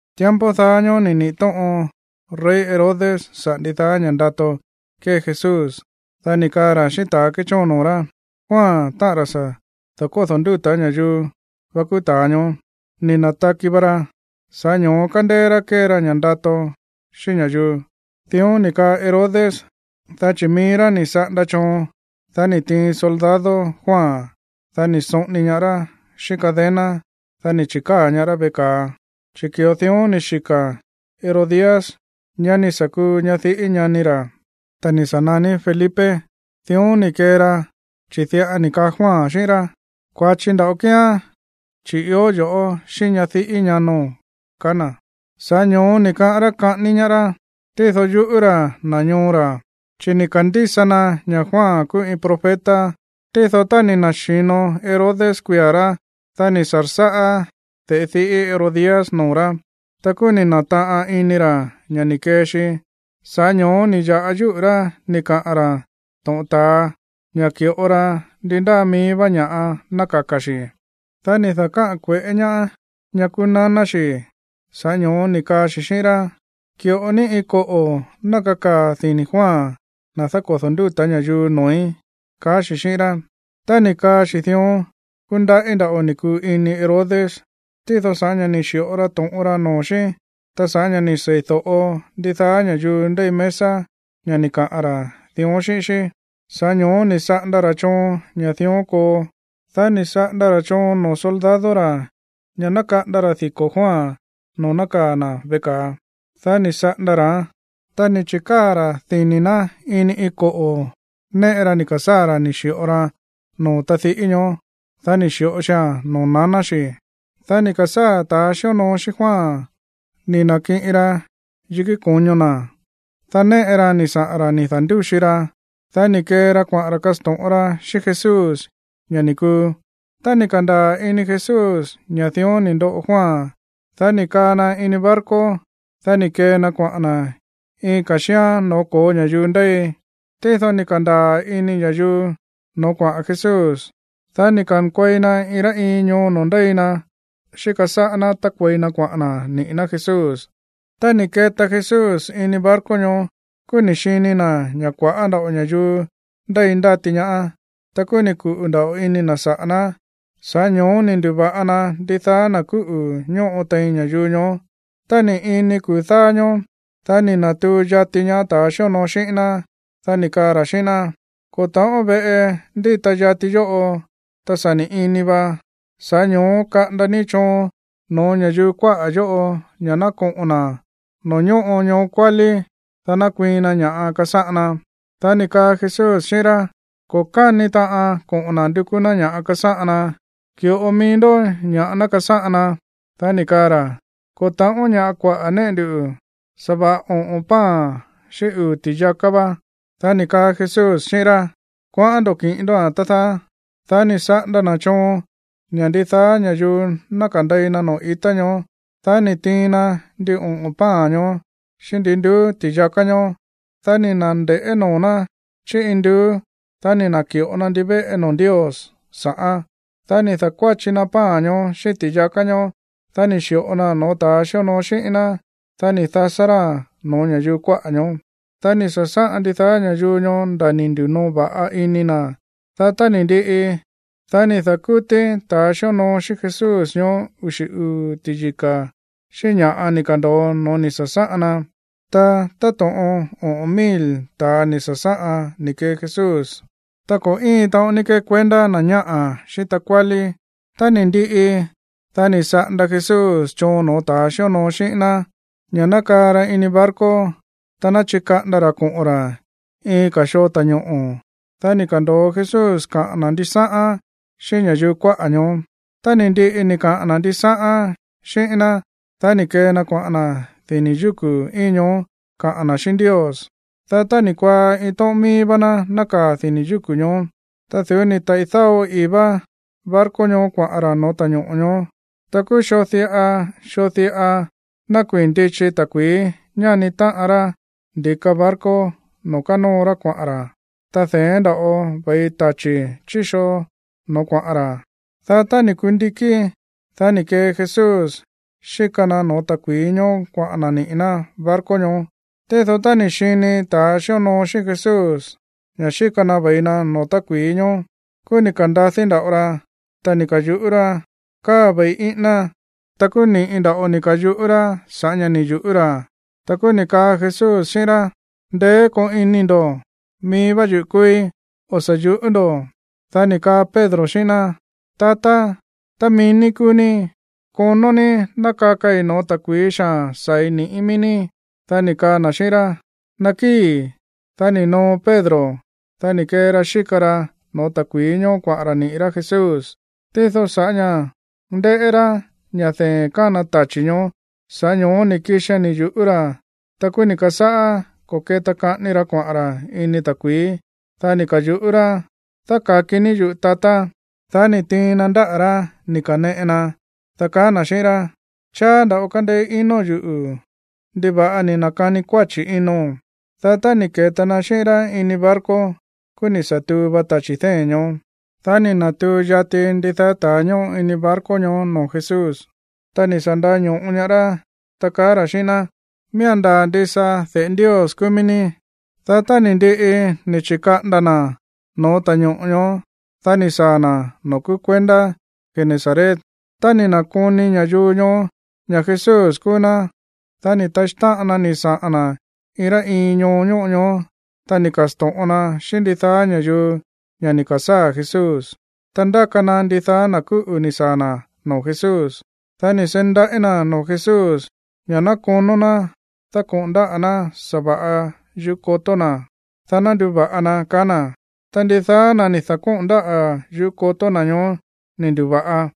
Tiempo daá ñóó ni̱ niꞌi̱ tóꞌon rey Herodes saꞌa̱ ndidaá ña̱ ndato kée Jesús. Dá ni̱ kaa ra̱ xíꞌín ta̱ kéchóon noo̱ rá: ―Juan, táꞌa̱n ra̱ sa̱ da̱kódo̱ ndúta̱ ña̱yuu va kúú ta̱a ñoó. Ni̱ na̱taki va ra, sa̱ꞌá ño̱ó kándéé rá kée ra ña̱ꞌa ndato xíꞌín ña̱yuu. Dión ni̱ kaa Herodes, dá chi̱ mií rá ni̱ saꞌanda choon, dá ni̱ tiin soldado Juan, dá ni̱ soꞌoni ñaá rá xíꞌín cadena, dá ni̱ chi̱káa̱ ñaá rá veꞌe ka̱a, chi̱ ki̱ꞌo dión ni̱ xika̱ Herodías, ñá ni̱ sa̱ kuu ñadiꞌí ñani ra̱, ta̱ ni̱ sa̱ naní Felipe. Dión ni̱ kee ra, chi̱ diꞌa ni̱ kaa Juan xíꞌín rá: ―Kua̱chi nda̱ꞌo kíán, chi̱ ió yo̱ꞌó xíꞌín ñadiꞌí ñano̱n ―kaá na̱. Sa̱ꞌá ño̱ó ni̱ kaꞌán rá kaꞌání ñaá rá, tído yuꞌú ra̱ na̱ ñoo ra̱, chi̱ ni̱ ka̱ndísa na ña̱ Juan kúú iin profeta. Tído tá ni̱ na̱xi̱no Herodes kuia̱ rá, dá ni̱ sa̱rsáꞌá de̱ꞌe diꞌí Herodías no̱ó rá. Ta kúú ni̱ na̱taꞌan ini ra̱ ña̱ ni̱ kee xi. Sa̱ꞌá ño̱ó ni̱ ya̱ꞌa yúꞌu̱ rá ni̱ kaꞌa̱n ra̱ to̱ꞌon ta̱a ña̱ ki̱ꞌo ra ndi ndáa míí vá ña̱ꞌa ná kaka̱ xi̱. Dá ni̱ da̱káꞌa̱n kue̱ꞌé ñaá ñá kúú naná xi̱. Sa̱ꞌá ño̱ó ni̱ kaa xi̱ xíꞌín rá: ―Ki̱ꞌo ní iin koꞌo̱ ná kakaa̱ dini̱ Juan, ta̱ dákodo̱ ndúta̱ ña̱yuu, noo̱í ―kaá xi̱ xíꞌín rá. Tá ni̱ kaa xi̱ dión, kúndaꞌí nda̱ꞌo ni̱ kuu ini Herodes, tído sa̱ꞌá ña̱ ni̱ xi̱ꞌo ra to̱ꞌon ra noo̱ xí, ta sa̱ꞌá ña̱ ni̱ seídóꞌo ndidaá ña̱yuu ndéi mesa ña̱ ni̱ kaꞌa̱n ra̱ dión xíꞌín xí, sa̱ꞌá ño̱ó ni̱ saꞌanda ra̱ choon ña̱ dión koo. Dá ni̱ saꞌanda ra̱ choon noo̱ soldado ra̱ ña̱ ná kaꞌanda ra̱ diko̱ Juan noo̱ nákaa̱ na̱ veꞌe ka̱a. Dá ni̱ saꞌanda ra̱án, ta ni̱ chi̱káa̱ ra̱ dini̱ ná ini iin koꞌo̱ néꞌe ra ni̱ ka̱sáa̱ ra̱ ni̱ xi̱ꞌo raa̱n noo̱ tadiꞌí ñoó. Dá ni̱ xi̱ꞌo xia̱n noo̱ naná xi̱. Dá ni̱ ka̱sáa̱ ta̱ xíonoo xíꞌín Juan ni̱ na̱kiꞌin ra yikí ko̱ño na̱. Dá néꞌe raa̱n ni̱ saꞌa̱n ra̱ ni̱ da̱ndúxi ra. Dá ni̱ kee ra kuaꞌa̱n ra̱ kasto̱ꞌon ra xíꞌín Jesús ña̱ ni̱ kuu. Tá ni̱ ka̱ndaa̱ ini Jesús ña̱ dión ni̱ ndoꞌo Juan, dá ni̱ kaa na ini iin barco, dá ni̱ kee na kuaꞌa̱n na̱ iin ka̱ xíán no̱ó ko̱ó ña̱yuu ndéi. Tído ni̱ ka̱ndaa̱ ini ña̱yuu noo̱ kuaꞌa̱n Jesús, dá ni̱ ka̱nkuei na iin rá iin ñoo noo̱ ndéi na xíka sáꞌá ná tákuei na kuaꞌa̱n na̱ niꞌi̱ ná Jesús. Tá ni̱ keta Jesús ini barco ñoó, kúú ni̱ xini na̱ ña̱ kua̱ꞌá nda̱ꞌo ña̱yuu ndéi ndáti ñaá. Ta kúú ni̱ kuꞌu̱ nda̱ꞌo ini na̱ saꞌa̱ ná, sa̱ꞌá ño̱ó ni̱ ndu̱va̱ꞌa na ndidaá na̱ kúꞌu̱ ñóꞌo tein ña̱yuu ñoó. Tá ni̱ ini kuu̱ dáá ñóó, dá ni̱ na̱tuu yati ñaá ta̱ xíonoo xíꞌín ná. Dá ni̱ kaa ra̱ xíꞌín ná: ―Ko̱ ta̱ꞌón veꞌe ndíta yati yóꞌo, ta sa̱ ni̱ ini va, sa̱ꞌá ño̱ó kaꞌanda ní choon no̱ó ña̱yuu kuáꞌa̱ yóꞌo ña̱ ná koꞌo̱n na̱ noo̱ ñóꞌo ñoo kuálí, dá ná kuiin na ña̱ꞌa kasáꞌan na. Dá ni̱ kaa Jesús xíꞌín rá: ―Ko̱ káni taꞌan koꞌo̱n na̱ ndukú ná ña̱ kasáꞌan na. Ki̱ꞌo mií ndoꞌó ña̱ꞌa ná kasáꞌan na. Dá ni̱ kaa ra̱: ―Ko̱ ta̱ꞌón ña̱ꞌa kuaꞌa̱ néꞌe ndu. Sa̱va̱ꞌa oꞌo̱n pan xíꞌín uu̱ ti̱yaká va. Dá ni̱ kaa Jesús xíꞌín rá: ―Kuaꞌán ndo̱ kiꞌin ndóa̱n, tá dáá. Dá ni̱ saꞌanda na̱ choon ña̱ ndidaá ña̱yuu ná kandei na noo̱ ita ñoó. Dá ni̱ tiin na ndin oꞌo̱n pan ñoó xíꞌín ndi nduú ti̱yaká ñoó. Dá ni̱ na̱nde̱ꞌé noo̱ ná chí induú. Dá ni̱ na̱ki̱ꞌo na ndivéꞌe noo̱ Ndios sa̱ꞌán. Dá ni̱ da̱kuáchi na pan ñoó xíꞌín ti̱yaká ñoó. Dá ni̱ xi̱ꞌo naa̱n no̱ó ta̱a xíonoo xíꞌín ná. Dá ni̱ dasá ráa̱n no̱ó ña̱yuu kuáꞌa̱ ñoó. Dá ni̱ sa̱sáꞌan ndidaá ña̱yuu ñoó nda̱ ni̱ ndi̱noo va̱ꞌa ini na̱. Dá tá ni̱ ndiꞌi, dá ni̱ da̱kútí ta̱ xíonoo xíꞌín Jesús ñoó uxi̱ uu̱ ti̱yika̱ xíꞌín ña̱ꞌa ni̱ ka̱ndo̱o no̱ó ni̱ sa̱sáꞌan na. Ta táto̱ꞌon oꞌo̱n mil ta̱a ni̱ sa̱sáꞌan ni̱ kee Jesús, ta ko̱ íin taꞌon ní kekuendá na̱ñáꞌa̱ xíꞌín takuálí. Tá ni̱ ndiꞌi, dá ni̱ saꞌanda Jesús choon no̱ó ta̱a xíonoo xíꞌín ná ña̱ ná kaa ra ini barco, ta ná chikaꞌanda ra̱ koꞌo̱n ra̱ iin ka̱ xoo ta̱ñoꞌo̱. Dá ni̱ ka̱ndo̱o Jesús kaꞌa̱n na̱ ndisáꞌán xíꞌín ña̱yuu kuáꞌa̱ ñoó. Tá ni̱ ndiꞌi ni̱ kaꞌa̱n na̱ ndisáꞌán xíꞌín ná, dá ni̱ kee na kuaꞌa̱n na̱ dini̱ yúku̱ íin ñoó kaꞌa̱n na̱ xíꞌín Ndios. Dá tá ni̱ kuaá, iin tóꞌón mií vá ná nákaa̱ dini̱ yúku̱ ñoó. Ta du̱ú ni̱ taꞌi̱ dáo ii̱ vá barco ñoó kuaꞌa̱n ra̱ no̱ó ta̱ñoꞌo̱ ñoó. Ta kúú xoo diꞌa xoo diꞌa nákuii̱n ndichi ta̱kui̱í ñáni táꞌan rá ndi̱ka barco noo̱ kánóo rá kuaꞌa̱n ra̱, ta de̱én nda̱ꞌo ve̱i tachi̱ chi̱ xoo no̱ó kuaꞌa̱n ra̱. Dá tá ni̱ kundikí, dá ni̱ kee Jesús xíka na no̱ó ta̱kui̱í ñóó kuaꞌa̱n na̱ niꞌi̱ ná barco ñoó. Tído tá ni̱ xini ta̱ xíonoo xíꞌín Jesús ña̱ xíka na ve̱i na no̱ó ta̱kui̱í ñóó, kúú ni̱ ka̱ndadí nda̱ꞌo ra, ta ni̱ ka̱yuꞌú rá: ―¡Káa ve̱i íꞌíná! Ta kúú ni̱ꞌi nda̱ꞌo ni̱ ka̱yuꞌú rá sa̱ꞌá ña̱ ni̱ yu̱ꞌú ra̱. Ta kúú ni̱ kaa Jesús xíꞌín rá: ―Ndeé koo ini ndo̱. Mií vá yuꞌu̱ kúúí. O̱ sa̱ yu̱ꞌú ndo̱. Dá ni̱ kaa Pedro xíꞌín ná: ―Tatá, tá mií ní kúú ní, konó ní ná kakai no̱ó ta̱kui̱í xaa̱n saa̱i̱ ni̱ꞌí mií ní. Dá ni̱ kaa na̱ xíꞌín rá: ―Nakíi̱. Dá ni̱ noo Pedro. Dá ni̱ kee ra xíka ra no̱ó ta̱kui̱í ñoó kuaꞌa̱n ra̱ niꞌi̱ rá Jesús. Tído sa̱ꞌá ña̱ ndéꞌé rá ña̱ dee̱n kána tachi̱ ñoó, sa̱ꞌá ño̱ó ni̱ kixian ni̱ yu̱ꞌú ra̱. Ta kúú ni̱ ka̱sáꞌá ko̱ke̱ta kaꞌani ra kuaꞌa̱n ra̱ ini ta̱kui̱í. Dá ni̱ ka̱yuꞌú rá: ―¡Dáka̱ki ní yuꞌu̱, tatá! Dá ni̱ tiin na ndáꞌa̱ rá ni̱ ka̱neꞌe na, dá kaá na̱ xíꞌín rá: ―Cháá nda̱ꞌo kándéé ino̱n yuꞌu̱. ¿Ndiva̱ꞌa ni̱ na̱kani kuáchi̱ ino̱n? Dá tá ni̱ ke̱ta na xíꞌín rá ini barco, kúú ni̱ sa̱ tuu va tachi̱ dée̱n ñoó. Dá ni̱ na̱tuu yati ndidaá ta̱a ñóꞌo ini barco ñoó noo̱ Jesús, ta ni̱ sa̱ nda̱ño̱ꞌo ñaá rá, ta kaá ra̱ xíꞌín ná: ―Miía̱n ndaa̱ ndisa de̱ꞌe Ndios kúú mií ní. Dá tá ni̱ ndiꞌi ni̱ chi̱kaꞌanda na̱ no̱ó ta̱ñoꞌo̱ ñoó, dá ni̱ saa̱ na̱ noo̱ kúú kuendá Genesaret. Tá ni̱ na̱koni ña̱yuu ñoó ña̱ Jesús kúú ná, dá ni̱ taxí táꞌan na ni̱ saꞌa̱n na̱ iin rá iin ñoo ñóꞌo ñoó, ta ni̱ ka̱sto̱ꞌon na xíꞌín ndidaá ña̱yuu ña̱ ni̱ ka̱sáa̱ Jesús. Ta ndáka na ndidaá na̱ kúꞌu̱ ni̱ saa̱ na̱ no̱ó Jesús. Dá ni̱ seí ndaꞌí na̱ noo̱ Jesús ña̱ ná konó ná dákoꞌo̱n ndáꞌa̱ ná sa̱va̱ꞌa yuꞌú kotó na̱, dá ná nduva̱ꞌa na, kaá na̱. Ta ndidaá na̱ ni̱ da̱kóꞌo̱n ndáꞌa̱ yuꞌú kotó na̱ ñoó ni̱ ndu̱va̱ꞌa.